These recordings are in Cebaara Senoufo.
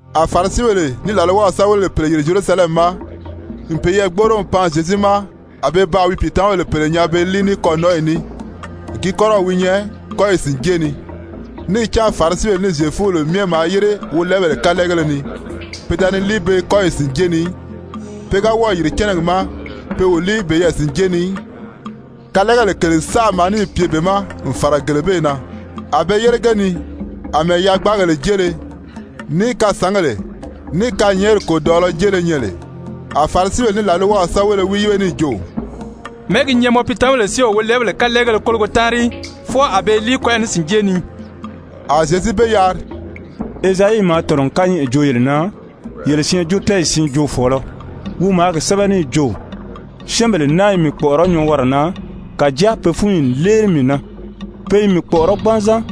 A Farisibèle ní làlwaw sɛ́bɛwelebèle pèle yìri Zyerusalɛmi ma n peyɛɛ gbóʔoro n pan Zyezu ma. A pe baa wi pìitamabèle pèle nyaa pe i líi ní kɔ̂nɔnʔɔyi ní, gi kɔ́rɔw wi nyɛ kɔ́yi sìnjée ni. Níì cán Farisibèle ní Zyefubèle myɛ maa yére wolɛɛbèle kalɛɛgéle ni, pe da ni líi be kɔ́yi sìnjée ni í. Pe ga wɔ́ɔ̀ yìri cɛ́nɛgi ma, pe o líi peyɛɛ sìnjée ni í. Kalɛɛgèle kèle saʔa maa níì pye be ma n fàra gele bee na, a be yére ge ni, àmɛɛ yagbaagèle jéele, ní kasǎngèle, ní kanyɛɛnri kòdɔʔɔlɔ jéele nyɛ lè. A Farisibèle ní làlwaw sɛ́bɛwelebéle wi yíbe níì jo: «Mɛ̀ɛ́ gi nyɛ mɔ piitamabèle si o wolɛɛbèle kalɛɛgéle kólogo táanri í, fwɔɔ a be i líi kɔ́yi sìnjée ni?» A Zyezu be yari: «Ezayi maa tɔ̀nɔ n kányɛʔɛ joo yele na, yele syɛɛnjóotɛɛyi siin joofɔɔlɔ, wi maa gi sɛ́bɛ níì jo: ‹Syɛ́ɛnbèle naa i mii kpɔ̀ʔɔrɔ́ nyɔɔwara na, kàjáa pe fúnyi n léeli mii na. Pe i mii kpɔ̀ʔɔrɔ́ gbanzan.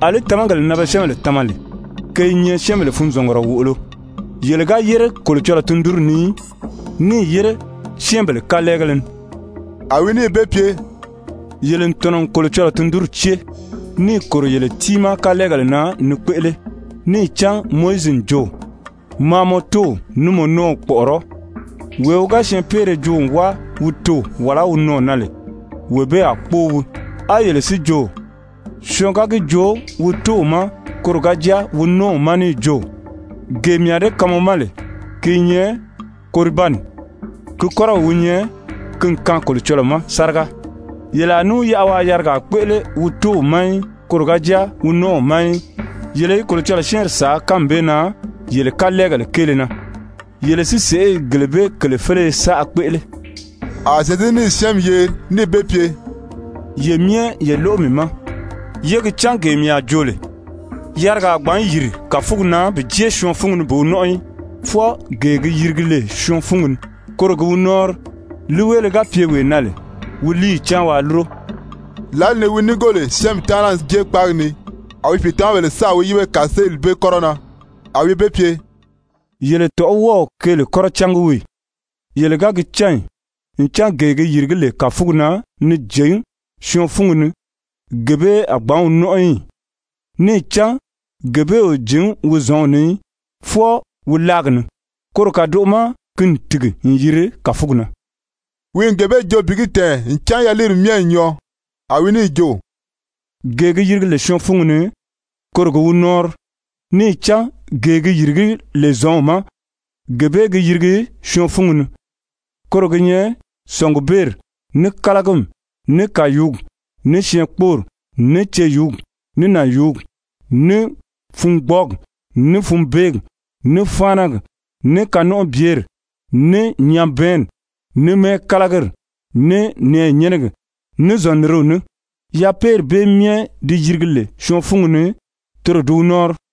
Alí tamagèle na be syɛ́ɛnbèle tama lè, ke i nyɛ syɛ́ɛnbèle funzɔngumɔ wòʔolo.› Yele ga yére Kolocɔlɔɔ tundunri ni í, níì yére syɛ́ɛnbèle kalɛɛgéle ni.» A wi níì be pye: «Yele n tɔ̀nɔ n Kolocɔlɔɔ tundunri cée, níì kòro yele tiimaa kalɛɛgèle na ni kpéʔele. Níì cán Mowizi n jo: ‹Maa mɔ tóow ní mɔ nɔ́ɔw kpɔ̀ʔɔrɔ́. Wee wi ga syɛɛnpeere joo n wáa wi toò wàlá wi nɔɔ̀ na lè, wee bee a kpóo wii.› A yele si jo: ‹Syɔɔn ga gi joo wi tóow ma koro ga jáa wi nɔ́ɔw ma níì jo: Gee mii a dée kaan mɔ ma lè, ki i nyɛ Koribani,› ki kɔ́rɔw wi nyɛ, ki n kaan Kolocɔlɔɔ ma sáriga, yele a ní wi yaʔa waa yarigaa kpéʔele wi tóow ma í, koro ga jáa wi nɔ́ɔw ma í. Yele i Kolocɔlɔɔ syɛ́ɛnri sàá kánmi bee na yele kalɛɛgèle kéele na. Yele si sèʔé i gele bee kèle féleye saʔa kpéʔele.» A Zyezu níì syɛ́ɛnmi yeri níì be pye: «Ye myɛ ye lóʔo mii ma, yé gi cán gee mii a joo lè: Yarigaa a gbǎn yìri kàfugi na bi jée syɔɔn fúngi ni bi wi nɔ́nʔɔ í, fwɔɔ gee gi yirigi lè syɔɔn fúngi ni, koro gi wi nɔ́ɔnri. [ Líiweele ga pye wee na lè wi líiyi cáan waa lúro.]» Lǎli ni wi núngo lè syɛ́ɛnmi taana n jée kpáagi ni, a wi pìitamabèle sáà wi yíbe kàseeli bee kɔ́rɔ na. A wi be pye: «Yele tɔ̀ʔɔ́ wɔ́ɔ o keele kɔ́rɔ cángi wii ì? Yele ga gi cán ì ncan gee gi yìrigí lè kàfugi na ni jǐn syɔɔn fúngi ni, gee bee a gbǎn wi nɔ́nʔɔ í ì? Níì cán gee bee o jǐn wi zɔ̌nw ni í, fwɔɔ wi láagi ni, koro kàdoʔo ma ki n tìgi n yiri kàfugi na.» Wi n gee bee joo bi gi tɛ̀ɛn ncan yaliiri myɛ n nyɔɔ. A wi níì jo: «Gee gi yirigi lè syɔɔn fúngi ni, koro gi wi nɔ́ɔnri, níì cán gee gi yìrigí lè zɔ̌nw ma, gee bee gi yirigi syɔɔn fúngi ni. Koro gi nyɛ: Sɔ̀ngubeeri, ní kálagimi, ní kàyuugi, ní syɛɛnkpoori, ní ceyuugi, ní nànyuugi, ní fungbɔɔgi, ní funbeegi, ní fáanagi, ní kanɔnʔɔbyeri, ní nyabɛɛnni, ní mɛ́ɛkalagiri, ní nɛ̀ɛnyɛnɛgi, ní zɔ̀nniriw ní. Yapeeri bee myɛ di yirigi lè syɔɔn fúngi ni, toro di wi nɔ́ɔnri.»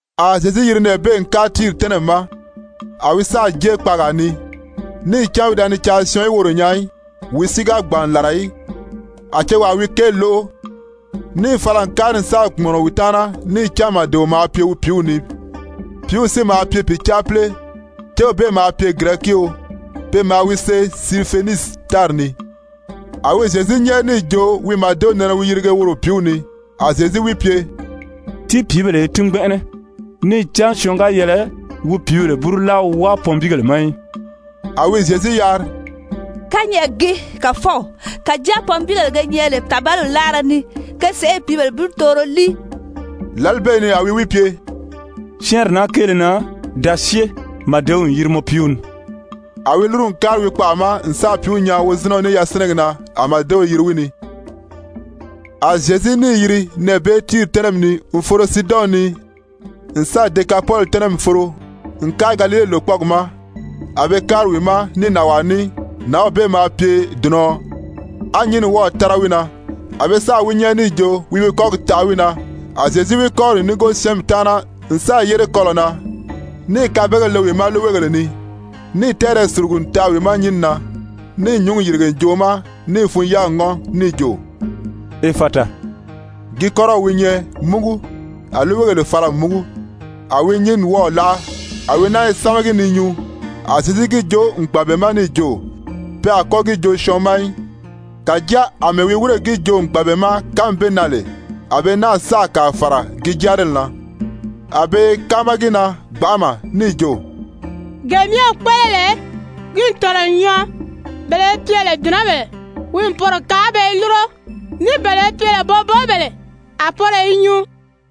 A Zyezu yiri nɛɛ bee n kári Tiiri tɛ́nɛmi ma. A wi sáà jée kpaagaa ni, níì cán wi da ni caa syɔɔn í woro nyaa í, wi si ga gbàn n làra í. A cewaa wi kéeli lóʔo, níì fala n kári n sáà kpùmɔnɔ wi taana, níì cán màdeo maa pye wi pìíw ni, pìíw si maa pye pìcaapile. Céw bee maa pye Girɛkio, pe maa wi see Sirifenisi tári ni. A wi Zyezu nyɛ́ɛri níì jo wi màdew nɛnɛ wi yirige woro pìíw ni. A Zyezu wi pye: «Tíi pìíbèle í tín gbɛnʔɛnɛ, níì cán syɔɔn ga yɛlɛ wi pìíbèle búru láa wi wáa pɔnbiigèle ma í.» A wi Zyezu yari: «Kányɛʔɛ gii, Kàfɔw kàjáa pɔnbiigèle ge nyɛ lè tàbaliw láara ni, ke sèʔé i pìíbèle búrutooro líi.» Lǎli bee ni a wi wi pye: «Syɛ́ɛnri naa kéele na, da syée, màdew n yiri mɔ piiw ni.» A wi lúru n kári wi kpaʔa ma n sáà pìíw nyaa wozinɛɔ ní yasinɛgi na, a màdew yiri wi ni. A Zyezu níì yiri nɛɛ bee Tiiri tɛ́nɛmi ni n foro Siidɔn ni, n sáà Dekapoli tɛ́nɛmi foro n kári Galile lòkpɔɔgi ma. A be kári wi ma ní nànwaa ní, nǎnw bee maa pye dùnɔ̄ɔ, á nyínni wɔ́ɔ̀ tára wi na. A be sáà wi nyɛ́ɛri níì jo wi wi kɔ́gi taʔa wi na. A Zyezu wi kɔ́ri n núngo syɛ́ɛnmi taana n sáà yére kɔlɔ̀ na, níì kabegèle le wi ma líiweegèle ni, níì tɛ́ɛrɛ sùlugu n taʔa wi ma nyínni na. Níì nyúngi yìrige ǹjoʔo ma níì fun-yáagi ŋɔ́n níì jo: «Efata,» gi kɔ́rɔw wi nyɛ, múgu. A líiweegèle fala n múgu, a wi nyínni wɔ́ɔ̀ láʔa, a wi náa i sámagi ni nyuu. A Zyezu gi joo n gbàn be ma níì jo pe a kɔ́ gi joo syɔɔn ma í. Kàjáa àmɛɛ wi wírè gi joo n gbàn be ma kánmi bee na lè, a be náa sáà kàa fàra ki jáarili na. A be i káama gi na gbanʔama níì jo: «Gee myɛ wi kpéʔele lè, ki n tɔ̀nɔ n nyɔɔ, bele be pye lè dùnɔbèle, wi n poro kaan a be i lúro, ní bele be pye lè boboobèle, a poro i nyuu.»